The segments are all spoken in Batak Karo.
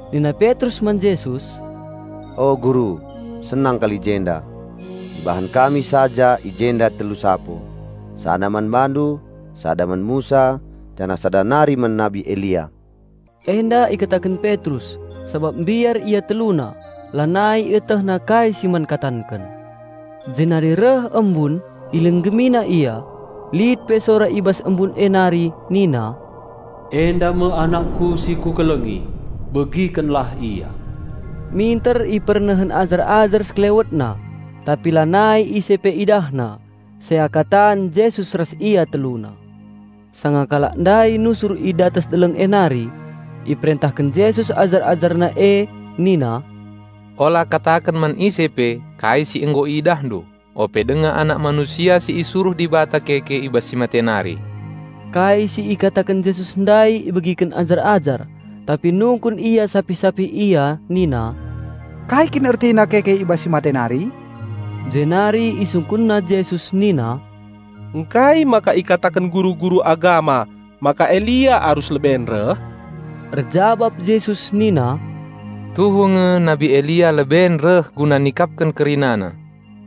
Nina Petrus man Jesus, "O Guru, senang kal i jenda. Ibahan kami saja i jenda telu sapo, sada man BaNdu, sada man Musa janah sada nari man Nabi Elia." Enda ikataken Petrus, sabap mbiar ia teluna, lanai ietehna kai si man katanken. Jenari reh embun, ilinggemina ia, lit pe sora i bas embun e nari nina, "Enda me AnakKu si Kukelengi, begikenlah Ia!" Minter ipernehen ajar-ajar sekelewetna tapi lanai ise pe idahna, seakatan Jesus ras ia teluna. Sanga kalak ndai nusur i datas deleng e nari, iperentahken Jesus ajar-AjarNa e nina, "Ola kataken man ise pe kai si nggo iidahndu, ope denga Anak Manusia si isuruh Dibata keke i bas si mate nari." Kai si ikataken Jesus ndai ibegiken ajar-ajar, tapi nungkun ia sapih-sapih ia nina, "Kai kin ertina keke i bas si mate nari?" Jenari isungkunna Jesus nina, "Ngkai maka ikataken guru-guru agama maka Elia arus leben reh?" Erjabap Jesus nina, "Tuhu nge nabi Elia leben reh guna nikapken kerinana.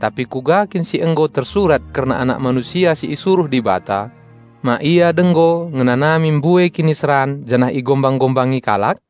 Tapi kuga kin si nggo tersurat kerna Anak Manusia si isuruh Dibata, ma Ia denggo ngenanami mbue kiniseran janah igombang-gombangi kalak?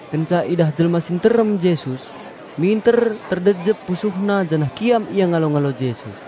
Kenca idah jelma si nterem Jesus, minter terdejep pusuhna janah kiam ia ngalo-ngalo Jesus.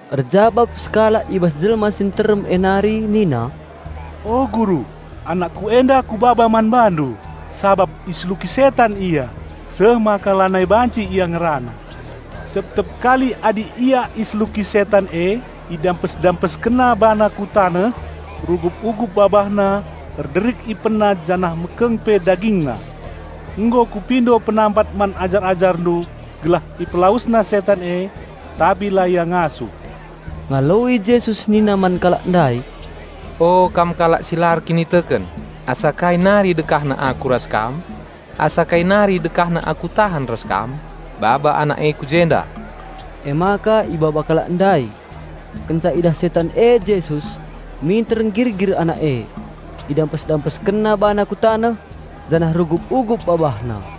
Erjabap sekalak i bas jelma si nterem e nari nina, "O Guru, anakku enda kubaba man BaNdu, sabap iseluki setan ia, seh maka lanai banci ia ngerana. Tep-tep kali adi ia iseluki setan e, idampes-dampeskenna bana ku taneh, rugup-ugup babahna, erderik ipenna janah mekeng pe dagingna. Nggo kupindo penampat man ajar-AjarNdu gelah ipelawesna setan e, tapi la ia ngasup." Ngaloi Jesus nina man kalak ndai, "O kam kalak si la erkiniteken, asa kai nari dekahna Aku ras kam? Asa kai nari dekahna Aku tahan ras kam? Baba anak e ku jenda." Emaka ibaba kalak ndai. Kenca idah setan e Jesus, minter nggirgir anak e, idampes-dampeskenna bana ku taneh, janah rugup-ugup babahna.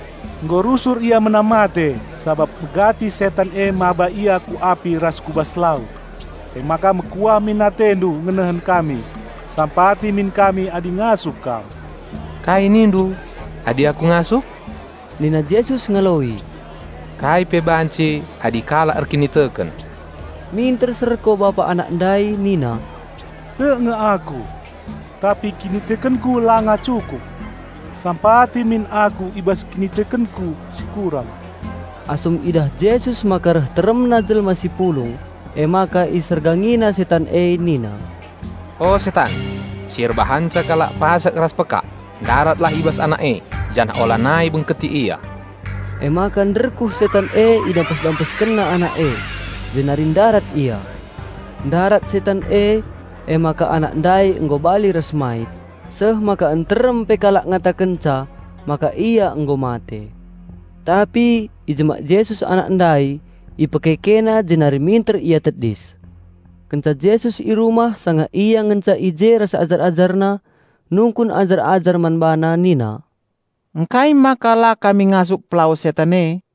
Nggo rusur ia menam mate, sabap megati setan e mbaba ia ku api ras ku bas lau. Emaka mekuah min AteNdu ngenehen kami, sampati min kami adi ngasup Kam." "Kai nindu? Adi Aku ngasup?" nina Yesus ngaloi. "Kai pe banci, adi kalak erkiniteken!" Minter serko bapa anak ndai nina, "Tek nge aku! Tapi kinitekenku langa cukup. Sampati min aku i bas kinitekenku si kurang." Asum idah Jesus maka reh teremna jelma si pulung, emaka IsergangiNa setan e nina, "O setan, si erbahanca kalak pasek ras pekak, ndaratlah i bas anak e, janah olanai bengketi ia!" Emaka nderkuh setan e idampes-dampeskenna anak e, jenari ndarat ia. Ndarat setan e emaka anak ndai nggo bali ras mait, seh maka nterem pe kalak ngatakenca maka ia nggo mate. Tapi ijemak Jesus anak ndai, IpekekeNa jenari minter ia tedis. Kenca Jesus i rumah, sanga Ia ngenca i je ras ajar-AjarNa, nungkun ajar-ajar man BaNa nina, "Ngkai maka la kami ngasup pelawes setan e?"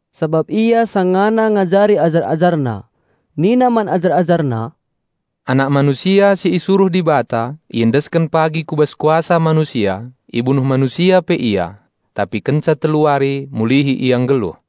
sabap Ia sangana ngajari ajar-AjarNa. Nina man ajar-AjarNa, "Anak Manusia si isuruh Dibata iendesken pagi ku bas kuasa manusia, ibunuh manusia pe Ia; tapi kenca telu wari, mulihi Ia nggeluh."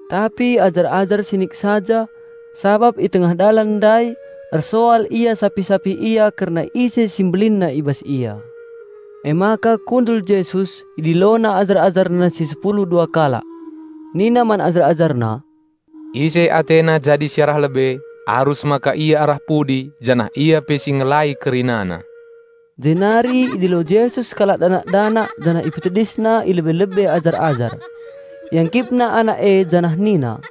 Tapi ajar-ajar sinik saja, sabap i tengah dalan ndai ersoal ia sapih-sapih ia kerna ise si mbelinna i bas ia. Emaka kundul Jesus, idilona ajar-AjarNa si sepulu dua kalak. Nina man ajar-AjarNa, "Ise atena jadi si arah lebe, arus maka ia arah pudi janah ia pe si ngelai kerinana." Jenari idilo Jesus sekalak danak-danak janah ipetedisna i lebe-lebe ajar-ajar. IangkipNa anak e janah nina,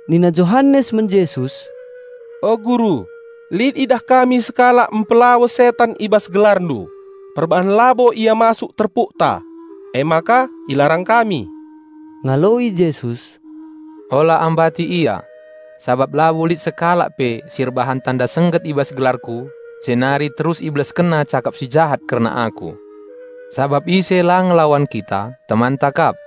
Nina Johanes man Jesus, "O Guru, lit idah kami sekalak mpelawes setan i bas GelarNdu. Perbahan labo ia masuk terpukta, emaka ilarang kami." Ngaloi Jesus, "Ola ambati ia! Sabap labo lit sekalak pe si erbahan tanda sengget i bas gelarKu, jenari terus ibelaskenna cakap si jahat kerna Aku. Sabap ise la ngelawan kita, temanta kap.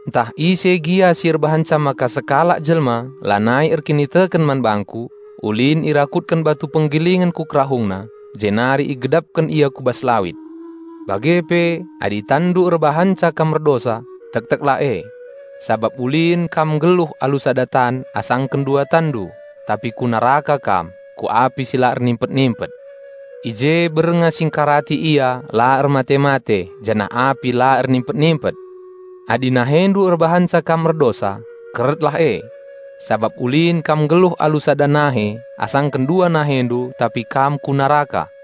"Ntah ise gia si erbahanca maka sekalak jelma lanai erkiniteken man bangKu, ulin irakutken batu penggilingen ku kerahungna, jenari igedapken ia ku bas lawit. Bage pe adi tanndu erbahanca kam erdosa, tekteklah e. Sabap ulin kam nggeluh alu sada tan asangken dua tanndu, tapi ku neraka kam, ku api si la ernimpet-nimpet. (I je bernga si ngkarati ia la ermate-mate, janah api la ernimpet-nimpet!) Adi nahendu erbahanca kam erdosa, keretlah e. Sabap ulin kam nggeluh alu sada nahe asangken dua nahendu tapi kam ku neraka.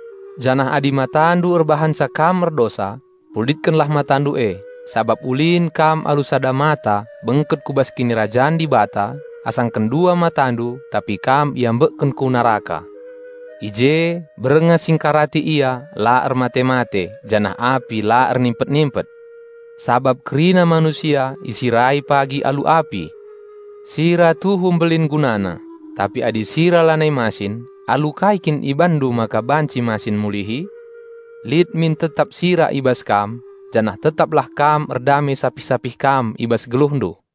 Janah adi matandu erbahanca kam erdosa, cungkillah matandu e, sabap ulin kam alu sada mata bengket ku bas Kinirajan Dibata asangken dua matandu tapi kam iambekken ku neraka. I je bernga si ngkarati ia la ermate-mate janah api la ernimpet-nimpet! Sabap kerina manusia isirai pagi alu api. Sira tuhu mbelin gunana, tapi adi sira lanai masin, alu kai kin ibanndu maka banci masin mulihi? Lit min tetap sira i bas kam, janah tetaplah kam erdame sapih-sapih kam i bas geluhndu."